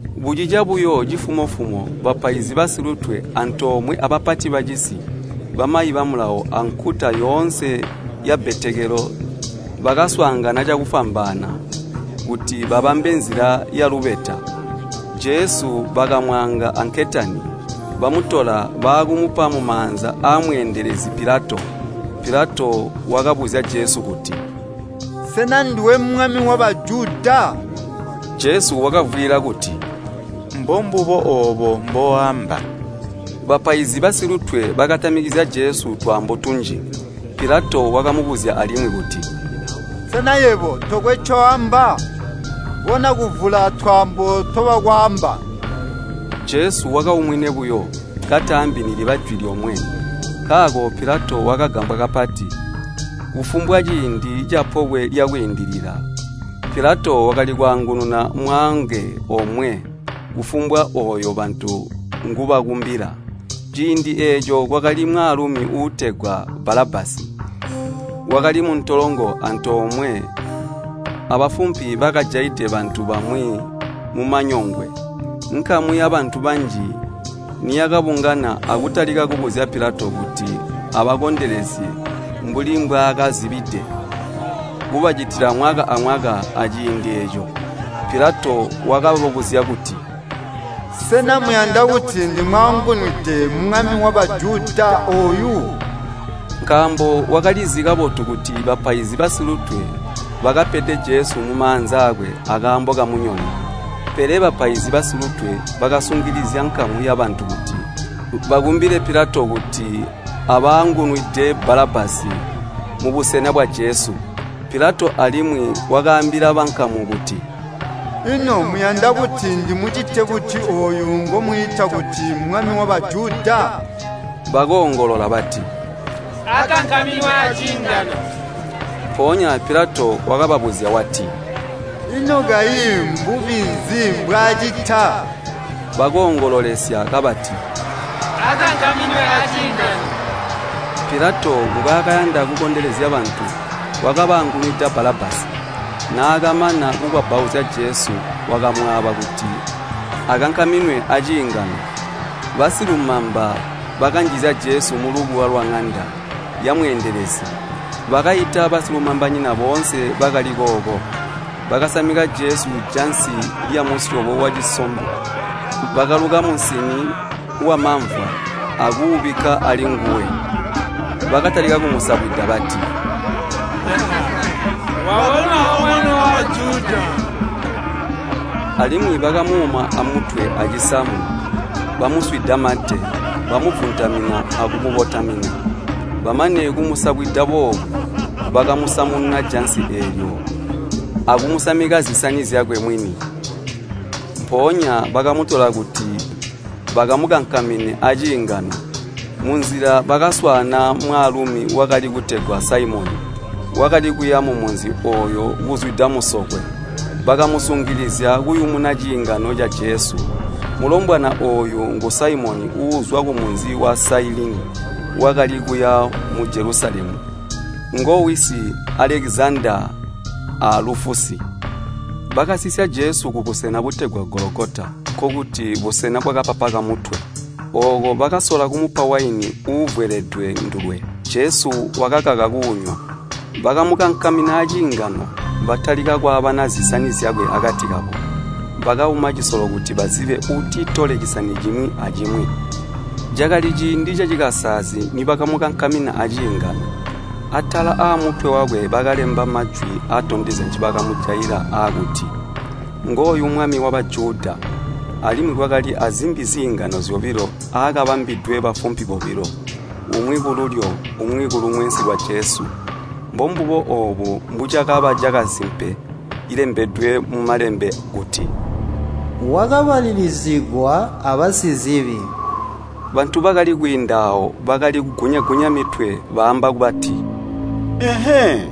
Bucica buyo cifumo-fumo, bapaizi basilutwe antoomwe abapati bacisi, bamayi ba Mulawo ankuta yoonse yabbetekelo bakaswaangana cakufwambaana kuti babambe nzila yalubeta. Jesu bakamwaanga anketani, bamutola baakumupa mumaanza aamweendelezi Pilato. Pilato wakabuzya Jesu kuti, “Sena nduwe mwami wa Bajuda?” Jesu wakavwiila kuti, “Mbombubo oobo mbooamba.” Bapaizi basilutwe bakatamikizya Jesu twaambo tunji. Pilato wakamubuzya alimwi kuti, “Sena yebo tokwe ncoamba? Bona kuvula twaambo ntobakwaamba.” Jesu wakaumwine buyo, kataambi niliba jwi lyomwe. Nkaako Pilato wakagambwa kapati. Kufumbwa ciindi ca Pobwe lya Kwiindilila Pilato wakali kwaangununa mwaange omwe kufumbwa ooyo bantu ngubakumbila. Ciindi eeco kwakali mwaalumi uutegwa Balabbasi, wakali muntolongo antoomwe abafumpi bakajaide bantu bamwi mumanyongwe. Nkamu yabantu banji niyakabungana akutalika kubuzya Pilato kuti abakondelezye mbuli mbwaakazibide kubacitila mwaka amwaka aciindi eeco, Pilato wakababuzya kuti, “Sena muyanda kuti ndimwaangunwide mwami wa Bajuda ooyu?” Nkaambo wakalizi kabotu kuti bapaizi basilutwe bakapede Jesu mumaanza aakwe akaambo kamunyono. Pele bapaizi basilutwe bakasungilizya nkamu yabantu kuti bakumbile Pilato kuti abaangunwide Balabbasi mubusena bwa Jesu. Pilato alimwi wakaambila bankamu kuti, “Ino muyanda kuti ndimucite buti ooyu ngomwiita kuti mwami wa Bajuda?” Bakoongolola bati, “Akankaminwe aciingano.” Mpoonya Pilato wakababuzya wati, “Ino kayi mbubi mbwaacita?” Bakoongololesya kabati, “Akankaminwe aciingano.” Pilato mbwaakayanda kukondelezya bantu, wakabaangunwida Balabbasi. Naakamana kukwabbauzya Jesu wakamwaaba kuti akankaminwe aciingano. Basilumamba bakanjizya Jesu mulubuwa lwaŋanda yamweendelezi, bakaita basilumambanyina boonse bakali kooko. Bakasamika Jesu jansi lyamusyobo wacisombo, bakaluka musini wamamvwa akuubikka alinguwe. Bakatalika kumusabwida bati, “Wabonwa O Mwami wa Bajuda.” Alimwi bakamuuma amutwe acisamu, bamuswida mate, bamuvuntamina akumukotamina. Bamane kumusabwida boobu, bakamusamununa jansi eelyo akumusamika zisani zyakwe mwini. Mpoonya bakamutola kuti bakamukankamine aciingano. Munzila bakaswaana mwaalumi wakali kutegwa Saimoni, wakali kuya mumunzi ooyo kuzwida musokwe, bakamusungilizya kuyumuna ciingano ca Jesu. Mulombwana ooyu ngu Saimoni uuzwa kumunzi wa Sailini wakali kuya mu Jelusalemu, ngowisi Alekizandaa a Lufusi. Bakasisya Jesu kubusena butegwa Gologota, nkokuti, “Busena Bwakapapa Kamutwe.” Ooko bakasola kumupa waini uuvweledwe ndulwe, Jesu wakakaka kuunywa. Bakamukankamina aciingano, batalika kwaabana zisani zyakwe akati kabo, bakauma cisolo kuti bazibe uutitole cisani cimwi acimwi. Cakali ciindi cacikasaalizi nibakamukankamina aciingano. Atala aamutwe wakwe bakalemba majwi atondezya ncibakamujaila aakuti, “Ngooyu Mwami wa Bajuda.” Alimwi kwakali azimbi ziingano zyobilo aakabambwidwe bafumpi bobilo, umwi kululyo umwi kulumwensi lwa Jesu. [ Mbombubo oobu mbucakaba cakasimpe cilembedwe mu Malembe kuti, “Wakabalilizigwa abasizibi.” Bantu bakali kwiinda aawo bakali kugunya-gunya mitwe, baamba bati, “Ehee!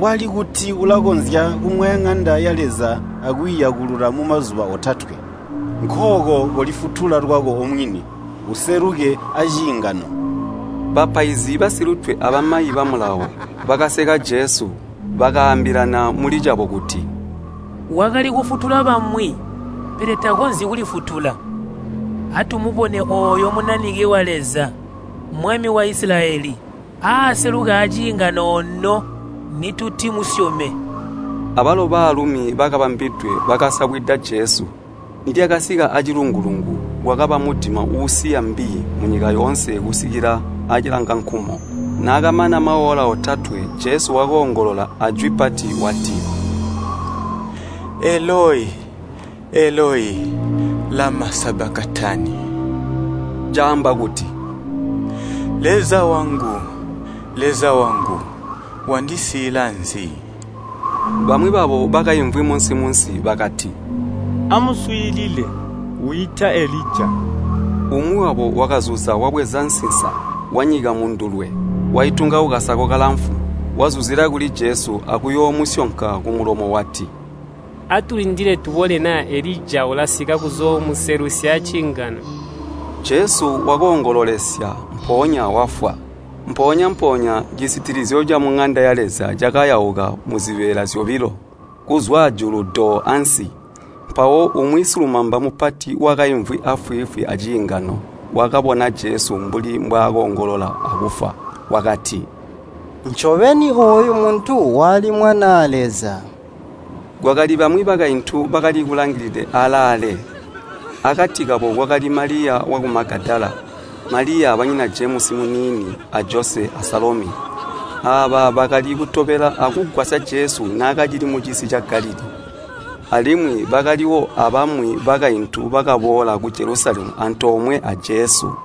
Wali kuti ulakonzya kumwaya ŋanda ya Leza akwiiyakulula mumazuba otatwe. Nkooko kolifutula lwako omwini, useluke aciingano.” Bapaizi basilutwe abamayi ba Mulawo bakaseka Jesu, bakaambilana muli cabo kuti, “Wakali kufutula bamwi, pele takonzyi kulifutula. Atumubone ooyo Munanike wa Leza, mwami wa Isilayeli, aaseluke aciingano ono, nitutimusyome.” Abalo baalumi bakabambwidwe bakasabwida Jesu. Nilyasika aacilungu-lungu, kwakaba mudima uusiya mbi munyika yoonse kusikila aacilangankumo. Naakamana maola otatwe Jesu wakoongolola ajwi pati wati, “Eloi, Eloi, lama sabakatani?” Caamba kuti, “Leza wangu, Leza wangu wandisiila nzi?” Bamwi babo bakaimvwi munsi-munsi, bakati, “Amuswiilile, wiita Elija!” Umwi wabo wakazuza wabweza nsinsa, wanyika mundulwe, waitunga kukasako kalamfu, wazuzila kuli Jesu akuyoomusyonka kumulomo wati, “Atulindile tubone naa Elija ulasika kuzoomuselusya aciingano.” Jesu wakoongololesya, mpoonya wafwa. Mpoonya-mpoonya cisitilizyo camuŋanda ya Leza cakayauka muzibeela zyobilo, kuzwa ajulu do ansi. Mpawo umwi silumamba mupati wakaimvwi aafwiifwi aciingano wakabona Jesu mbuli mbwaakoongolola akufwa, wakati, “Ncobeni ooyu muntu wali Mwanaa Leza.” Kwakali bamwi bakaintu bakali kulangilide alaale. Akati kabo kwakali Maliya waku Magadala, Maliya banyina Jemusi muniini a Jose a Salomi. Aaba bakali kutobela akugwasya Jesu naakacili mucisi ca Galilii. Alimwi bakaliwo abamwi bakaintu bakaboola ku Jelusalemu antoomwe a Jesu.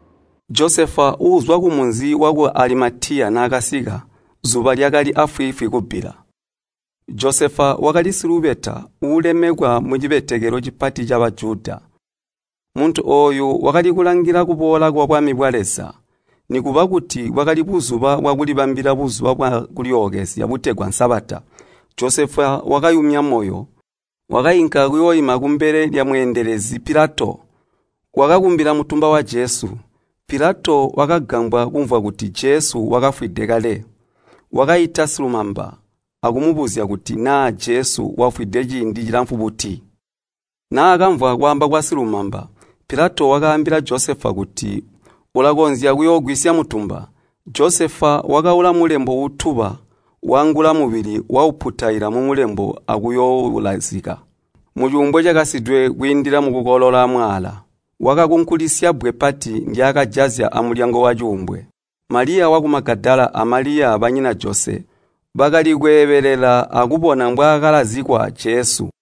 Josefa uuzwa kumunzi waku Alimatiya naakasika zuba lyakali aafwiifwi kubbila. Josefa wakali silubeta uulemekwa mucibetekelo cipati ca Bajuda. Muntu ooyu wakali kulangila kuboola kwabwami bwa Leza. Nikuba kuti bwakali buzuba bwakulibambila Buzuba bwa Kulyookezya butegwa Sabata, Josefa wakayumya moyo, wakainka kuyooima kumbele lyamweendelezi Pilato, wakakumbila mutumba wa Jesu. Pilato wakagambwa kumvwa kuti Jesu wakafwide kale. Wakaita silumamba akumubuzya kuti naa Jesu wakafwide ciindi cilamfu buti. Naakamvwa kwaamba kwasilumamba, Pilato wakaambila Josefa kuti ulakonzya kuyoougwisya mutumba. Josefa wakaula mulembo uutuba, waangula mubili wauputaila mumulembo akuyooulazika mucuumbwe cakasidwe kwiindila mukukolola mwaala. Wakakunkulisya bbwe pati ndyaakajazya amulyango wacuumbwe. Maliya waku Magadala a Maliya banyina Jose bakali kweebelela akubona mwaakalazikwa Jesu.